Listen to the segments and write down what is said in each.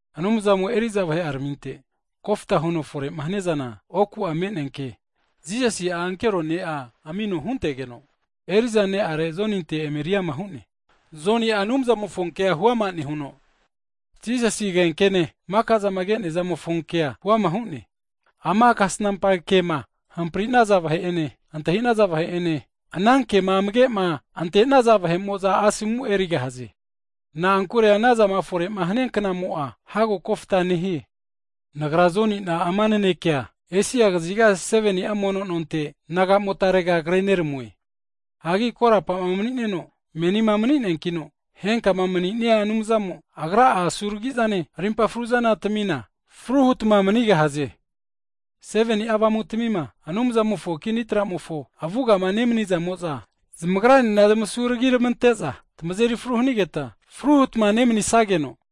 Anumzamo'a eri'za vahe'araminte kofta huno fore'ma haniazana, oku'a me'nea ke Jisasi'a ankero ne'a amino huntegeno, eri'za ne'are Joninte emeri ama hu'ne. Joni'a Anumzamofonkea huama nehuno, Jisasi agenkene maka'zama ke'nea zamofo kea huama hu'ne. Ama kasnampa kema hamprinaza vahe'ene, antahi'naza vahe'ene, ana kema amage'ma antenaza vahe'mo'za asomu erigahaze. Na'ankure anazama fore'ma hania knamo'a, hago kofta nehie. Nagra Joni'na, ama naneke Esia kaziga 7ni'a mono nonte naga'motarega avona kreneramue. Hagi korapa mani'neno, menima mani'neankino, henkama mani'nia Anumzamo, Agra'a asuragi'zane, rimpa fruzana tamina, fru hutma manigahaze. Hagi 7ni'a Avamutamima Anumzamofo kini tramofo avugama nemanizamo'za, zamagranena zamasu ragiramante'za, tamazeri fru hanigeta, fru hutma nemanisageno,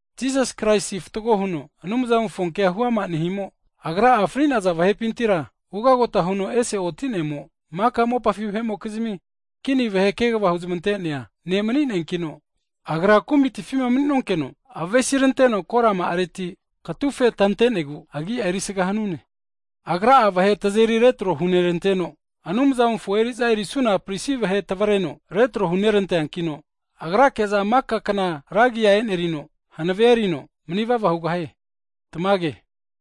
Jisas Kraisi fatgo huno, Anumzamofo ke'a huama nehimo, Agra'a fri'naza vahepintira ugagota huno ese oti'nemo, maka mopafi vahe'mokizmi kini vahe kegava huzmante'nea ne'manin'eankino, Agra kumitifima mani'nonkeno, avesiranteno korama'areti mizaseno katufe tantenegu agi'a erisaga hanune. Agra'a vahe tazeri retro huneranteno, agra tavreno Anumzamofo eri'za erisuna pristi vahe retro hurante'neankino, Agrake'za maka kna ra agi'a e'nerino hanavea erino, manivava hugahie. Tamage.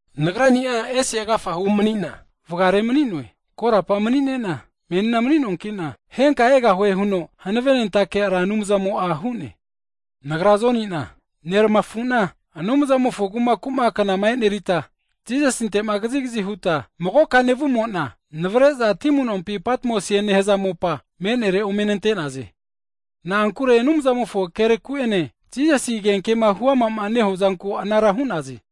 Nagrani'a ese agafahu manina (Alfa), vagare mani'noe (Omega). Korapa mani'nena, menina mani'noankina, henka egahue huno hanavenentake Ra Anumzamo'a hu'ne. Nagra Joni'na neramafu'na Anumzamofo kumaku'ma knama enerita Jisasinte'ma kazigazi huta magoka nevumo'na, navre'za ti amunompi Patmosie nehaza mopa, me'nere ome nante'naze. Na'ankure Anumzamofo kereku'ene, Jisasi agenkema huama'ma nehua zanku anara hu'naze.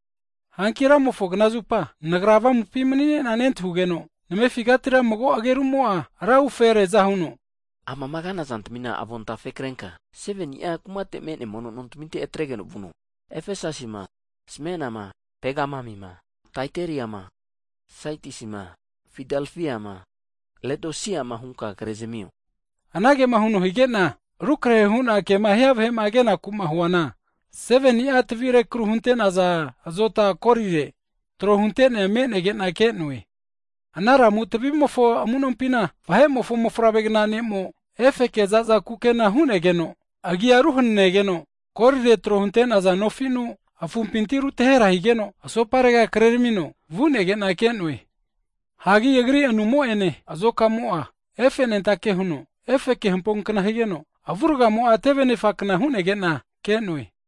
Hanki Ramofo knazupa, nagra avamupi mani'ne'na nentahugeno, namefigatira mago agerumo'a ra ufereaza huno anage hu'ne, Amama kana zantamina avontafe krenka, 7ni'a kumate me'nea mono nontaminte atregeno vino. Efesasima, Smenama, Pegamamima, Taitariama, Sadisima, Fildafiama, Ledosiama hunka krezamio. Anagema huno hige'na, rukrehe hu'na kema hia vahe kenaku'ma huana, 7ni'a tavi rekru hunte'naza azota golire tro hunte'nea me'negena ke'noe. Ana lamu tavimofo amu'nompina, Vahe'mofo Mofavregna ne'mo, efeke za'za kukena antaninegeno agia ruhananegeno, golire tro hunte'naza nofinu afumpinti rutahera higeno, asoparega kreramino vu'nege'na ke'noe. Hagi Agri asenimo'ene azokamo'a efenentake huno efeke hampokna higeno, avurgamo'a teve anefakna hu'negena ke'noe.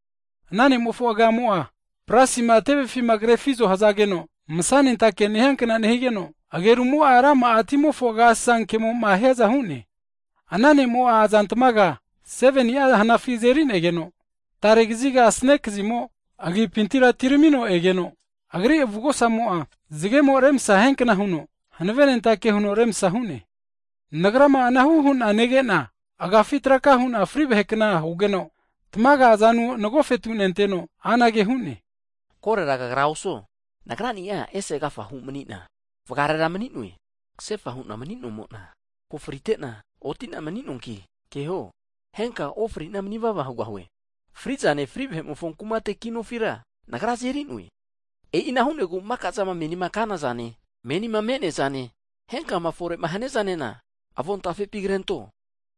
Ana Ne'mofo agamo'a brasima tevefima krefizo hazageno, masanentake nehiankna nehigeno, agerumo'a rama'a timofo agasasa kemo'ma hiaza hu'ne. Ana ne'mo'a azantmaga 7ni'a hanafi azeri'negeno, tare kaziga asane kazimo agipintira atiramino egeno, Agri avugosamo'a zagemo remsa hiankna huno hanavenentake huno remsa hu'ne. Nagrama ana ne'ma nege'na, agafi traka hu'na fri vahekna hugeno, tamaga azanu nagofetu nenteno anage hu'ne, Korera kagra osuo, Nagrani'a ese agafahu mani'na, vagarera mani'noe. Kasefa hu'na mani'nomo'na ko frite'na, oti'na mani'noanki, keho, henka'a ofri'na manivava hugahue. Fri'zane, fri vahe'mofo kumate ki nofira Nagra azeri'noe. E'ina hu'negu maka'zama menima kana zane, menima me'neazane, henkama fore'ma haniazanena avontafepi krento.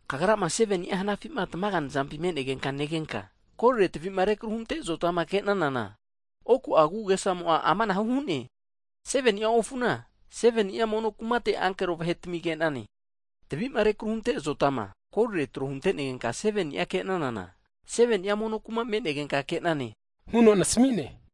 Kagrama 7ni'a hanafi'ma tamaga nazampima me'negenka negenka, golire tavima rekru hunte azotama ke'nanana oku'a agu'agesamo'a amanahu hu'ne, 7ni'a ofuna, 7ni'a mono no kumate ankero vahetami ke'nane, tavi'ma rekru hunte azotama, golire tro huntenegenka 7ni'a ke'nanana, 7ni'a mono nontami me'negenka ke'nane huno nasami'ne.